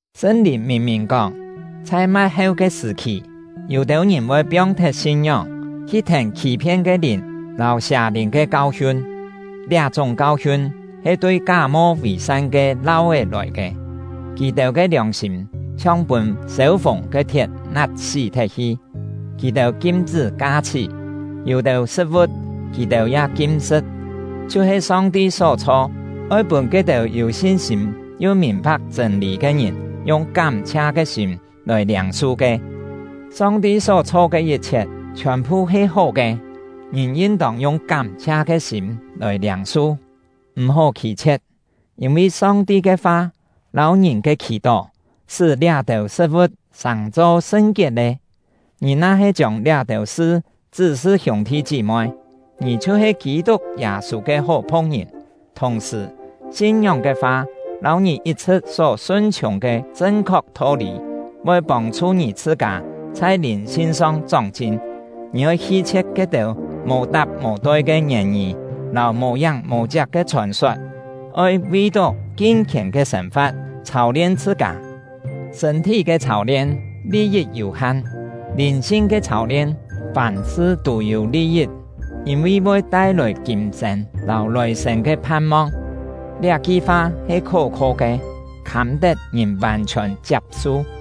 Sṳn-Lìn mìn-mìn kóng, chhai ma̍t-heu ke sṳ̀-khì, yû-têu ngìn voi piong-thet sin-ngióng, hi thèn khî-phien ke lìn lâu sià-lìn ke kau-hiun. Liá-chúng kau-hiun he tui ká-mo vì-san ke lau-é lòi ke; kì-têu ke liòng-sîm chhiong pûn sêu-fùng ke thiet nat-sí thet-hi. Kì-têu kim-chṳ́ ka-chhí; yû-têu sṳ̍t-vu̍t kì-têu ya kim-sṳ̍t, chhiu-he Song-ti só chho, oi pûn ke-têu yû sin-sîm yu mìn-pha̍k chṳ̂n-lî ke ngìn yung kám-chhia ke sîm lòi liâng-su ke. Song-ti só chho ke yit-chhiet chhiòn-phu he hó ke, ngìn yin-tông yung kám-chhia ke sîm lòi liâng-su, m̀-hó khî-chhie̍t, yîn-vi Song-ti ke fa lâu ngìn ke khì-tó sṳ́ liá-têu sṳ̍t-vu̍t sàng-cho sṳn-kiet lé. Ngì na-he chiông liá-têu sṳ chṳ́-sṳ hiûng-thi chí-moi, ngì chhiu-he Kî-tuk Yâ-sû ke hó phu̍k-ngìn; thùng-sṳ̀, sin-ngióng ke fa lâu ngì yit-chhṳ̍t só sun-chhiùng ke chṳn-khok tho-lî, voi pông-chhu ngì chhṳ-kâ chhai lìn-sin-song chóng-chin. Ngì oi hi-chhie̍t ke-têu mò-tap mò-toi ke ngièn-ngî lâu mò-yáng mò-chiak ke chhòn-sot; oi vi-tó kin-khièn ke sên-fa̍t chhâu-lien chhṳ-kâ. Sṳ̂n-thí ke chhâu-lien, li-yit yû-han; lìn-sin ke chhâu-lien, fàm-sṳ tû-yû li-yit, yîn-vi voi tai-lòi kîm-sên lâu lòi-sên ke phan-mong. Liá-ki fa he khó-kho ke, khâm-tet ngìn vàn-chhiòn chiap-su.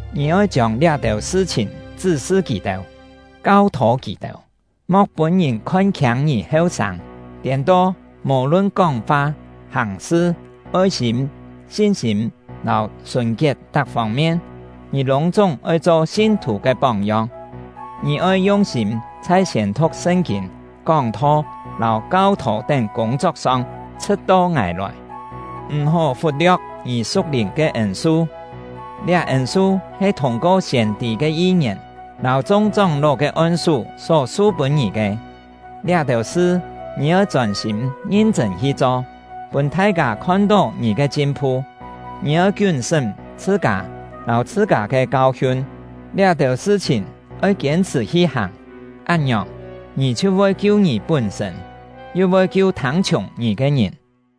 Ngì oi chiông liá-têu sṳ-chhìn chṳ́-sṳ kì-têu, kau-thô kì-têu. Mo̍k pûn ngìn khon-khiâng ngì heu-sâng; tiên-to, mò-lun kóng-fa, hàng-sṳ, oi-sîm, sin-sîm, lâu sùn-kiet tak fông-mien, ngì lûng-chúng oi cho sin-thù ke póng-yong. Ngì oi yung-sîm chhai siên-thu̍k Sṳn-kîn, kóng-tho, lâu kau-thô tén kûng-chok-song, chhṳ̍t-to ngài lòi. M̀-hó fut-lio̍k ngì su̍k-lìn ke ên-su; liá ên-su he thûng-ko siên-tî ke yi-ngièn lâu chung chóng-ló ke on-sú só su-pûn ngì ke. Liá-têu sṳ ngì oi chôn-sîm ngin-chṳ̂n hi cho, pûn thai-kâ khon-tó ngì ke chin-phu. Ngì oi kiún-sṳ́m chhṳ-kâ lâu chhṳ-kâ ke kau-hiun. Liá-têu sṳ-chhìn oi kiên-chhṳ̀ hi hàng; án-ngiòng, ngì chhiu voi kiu ngì pún-sṳ̂n, yu voi kiu thâng-chhiùng ngì ke ngìn.